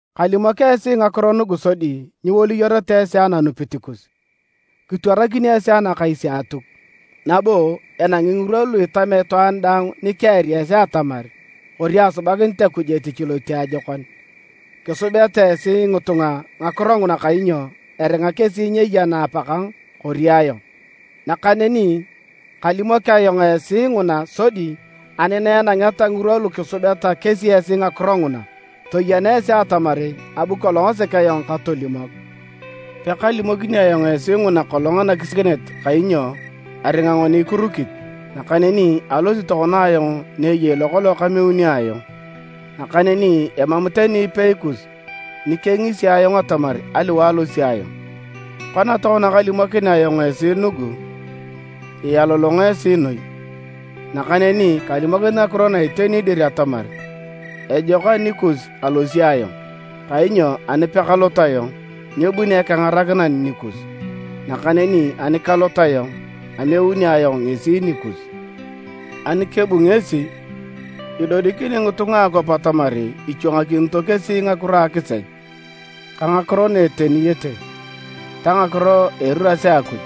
“Kalimok esi ngakiro nugu sodi nyiwolioreta esi ananupit kus. Kitwarakinio esi anakais a Atuk. Nabo enangi ngirwa lu itamea itwaan daang nikiari esi atamar kori asubakinit Akuj etich lotiajokon. Kisubeta esi ngitunga ngakiro nguna kainyo eringa kesi nyeyena Apakang kori ayong. Nakaneni kalimok ayong esi nguna sodi ani na enangeta ngirwa lu kisubeta kesi esi ngakiro nguna, toyeneta esi atamar abu kolong sek ayong katolimok. Etich a Etau a Akuj “Pekalimokini ayong esi nguna kolong anakisiakinet kainyo aringa ngoni kirukit. Nakaneni alosi tokona ayong ni eyei lokolong kameuni ayong, nakaneni emam tani ipei kus ni kengisi ayong atamar aliwae alosi ayong. Kona tokona kalimokinea ayong esi nugu, ialolongo esi noi. Nakaneni kalimokinit ngakiro na iteni dir atamar ejok anikus alosi ayong, kainyo ani pekalot ayong, nyebuni Ekengarakinan nikus. Nakaneni ani kalot ayong, ameuni ayong ngesi nikus. Ani kebu ngesi, idodikini ngitunga a akwap atamar ichwangakinito kesi ngakiro a akisech, ka ngakiro na eteniyete ta ngakiro a eriras a Akuj.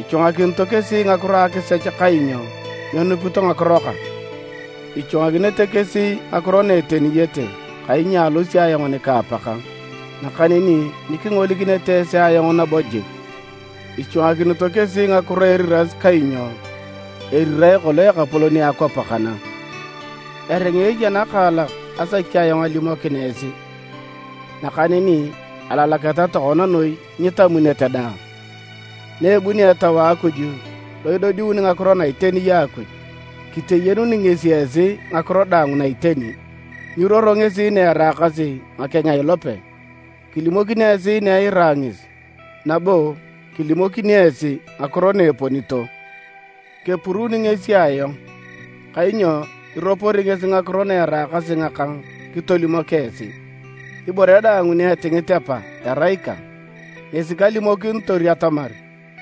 Ichwangakinito kesi ngakiro a akisech kainyo nyenupito ngakiro kang, ichwangakinete kesi ngakiro na eteniyete kainyo alosi ayong nika Apakang, nakaneni nyikingolikinete esi ayong nabo jik, ichwangakinito kesi ngakiro a eriras kainyo erirae kolong ekapolon a akwap kana. “Eringa eya nakaalak asaki ayong alimokin esi, nakaneni alalaketa tokona noi nyitamunete daang. Na ebunio Etau a Akuj lo idodiuni ngakiro na iteni a Akuj, kiteyenuni ngesi esi ngakiro daang na iteni. Nyiruoro ngesi naeraakasi ngakeng a ilope, kilimokini esi na eira ngesi, nabo kilimokini esi ngakiro na eponito. Kepuruuni ngesi ayong, kainyo iropori ngesi ngakiro naeraakasi ngakang kitolimok esi. Ibore daang ni etingit Apa erai ikang, ngesi kalimokinitor atamar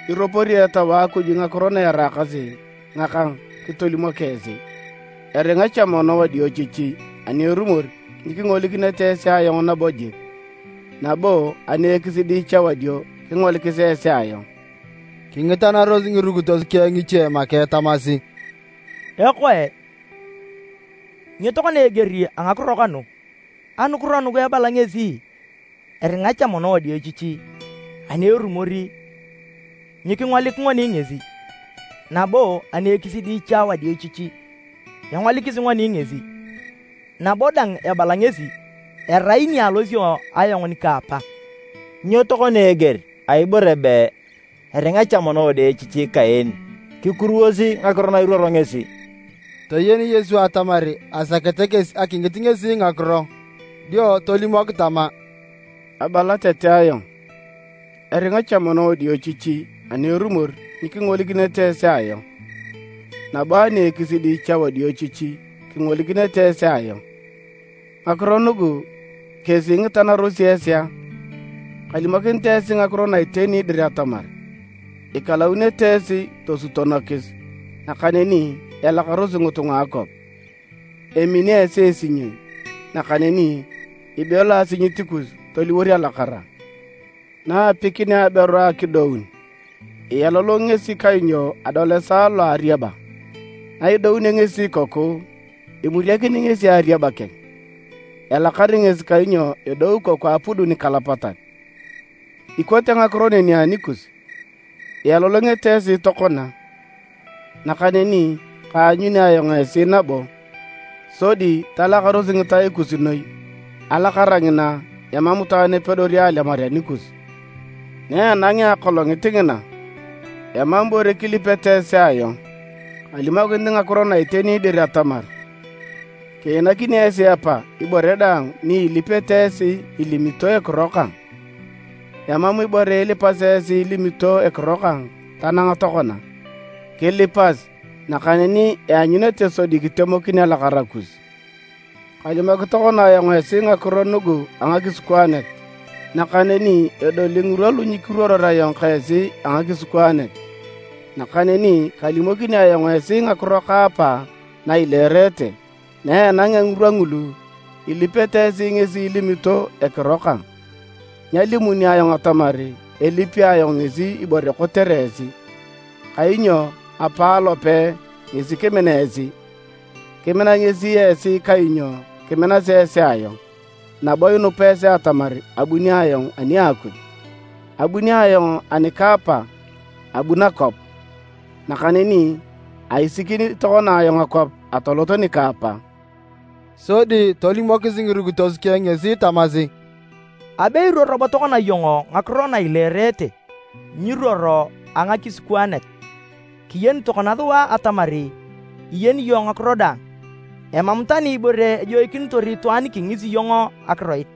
iropori Etau a Akuj ngakiro na eraakasi ngakang kitelimok esi. “Eringa cha mono wadiochichi ani erumor nyikingolikinete esi ayong nabo jik, nabo ani ekisidi cha wadio kingolikis esi ayong.” Kingitanaros ngirukitos keng ngiche make tamasi, “Ekoe! Nyo tokona eger a ngakiro kanu? Anukiro nugu ebala ngesi eringa cha mono wadiochichi ani erumor nyikingolik ngoni ngesi, nabo ani ekisidi cha wadiochichi engolikisi ngoni ngesi. Nabo dang ebala ngesi, ‘Erai ni alosio ayong nika Apa.’ Nyo tokona eger a ibore be ‘eringa cha mono wadiochichi’ kaen? Kikuruwosi ngakiro na iruoro ngesi!” Toyen Yesu atamar asakete kesi akingit ngesi ngakiro, dio tolimok tama, “Abala tete ayong, ‘Eringa cha mono wadiochichi ani erumor nyikingolikinete esi ayong, nabo ani ekisidi cha wadiochichi kingolikinete esi ayong.’ Ngakiro nugu kesi ingitanarosi esi a? Kalimokinit esi ngakiro na iteni dir atamar ikalounete esi tosutonokis, nakaneni elakarosi ngitunga a akwap, emini esi esinyoi, esi nakaneni ibelo asinyit kus toliwor alakara. Na apikinea aberu akidoun, ialolongi ngesi kainyo adol esaa lo a ariaba, na idounio ngesi ikoku, imuriakini ngesi ariaba keng, elakar ngesi kainyo edou ikoku apudu nikalapatan. Ikote ngakiro neni anikus, ialolongete esi tokona, nakaneni kaanyuni ayong esi nabo, sodi talakaros ngitai kus noi, alakara ngina, emam itwaan epedori alemar anikus. “Naenangea akolongit ngina, emam ibore kilipete esi ayong. Kalimokinit ngakiro na iteni dir atamar, kiinakini esi Apa ibore daang ni ilipete esi ilimito ekiro kang. Emam ibore ilipasi esi ilimito ekiro kang tanang tokona, kilipas nakaneni ianyunete sodi kitemokin alakara kus. “Kalimok tokona ayong esi ngakiro nugu a ngakisikwaanet, nakaneni edoli ngirwa lu nyikiruoror ayong ka esi a ngakisikwaanet, nakaneni kalimokini ayong esi ngakiro ka Apa na ileerete. Na enangea ngirwa ngulu, ilipete esi ngesi ilimito ekiro kang, nyalimuni ayong atamar elipi ayong ngesi ibore kotere esi. Kainyo Apa alope ngesi kimina esi. Kimina ngesi esi kainyo kiminasi esi ayong, nabo inupa esi atamar abuni ayong ani a Akuj. Abuni ayong ani ka Apa abu nakwap, nakaneni aisikini tokona ayong akwap atolot nika Apa.” Sodi tolimokis ngirukitos keng ngesi tamasi, “Abe iruoro bo tokona iyong ngakiro na ileerete, nyiruoro a ngakisikwaanet. Kiyeni tokona sua atamar iyeni iyong ngakiro daang. Emam tani ibore ejoikinitor itwaan kingisi iyong akiroit.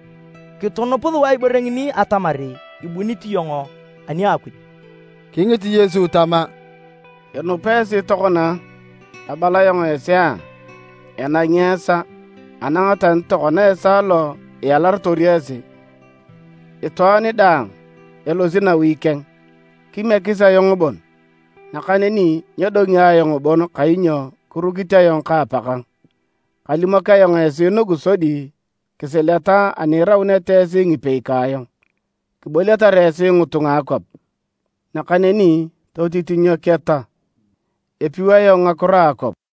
Kitunup sua ibore ngini atamar ibunit iyong ani a Akuj.” Kingit Yesu tama, “Inupa esi tokona a? Abala ayong esi a! Enangi esaa, anang tani tokona esaa lo ialarotor esi, itwaan daang elosi nawi keng, kimiekis ayong bon, nakaneni nyedongi ayong bon kainyo kirukit ayong ka Apakang. Kalimok ayong esi nugu sodi kisileta ani irauneta esi ngipei ka ayong. Kiboliatar esi ngitunga a akwap. Nakaneni totitinyoketa! Epiu ayong ngakiro a akwap!”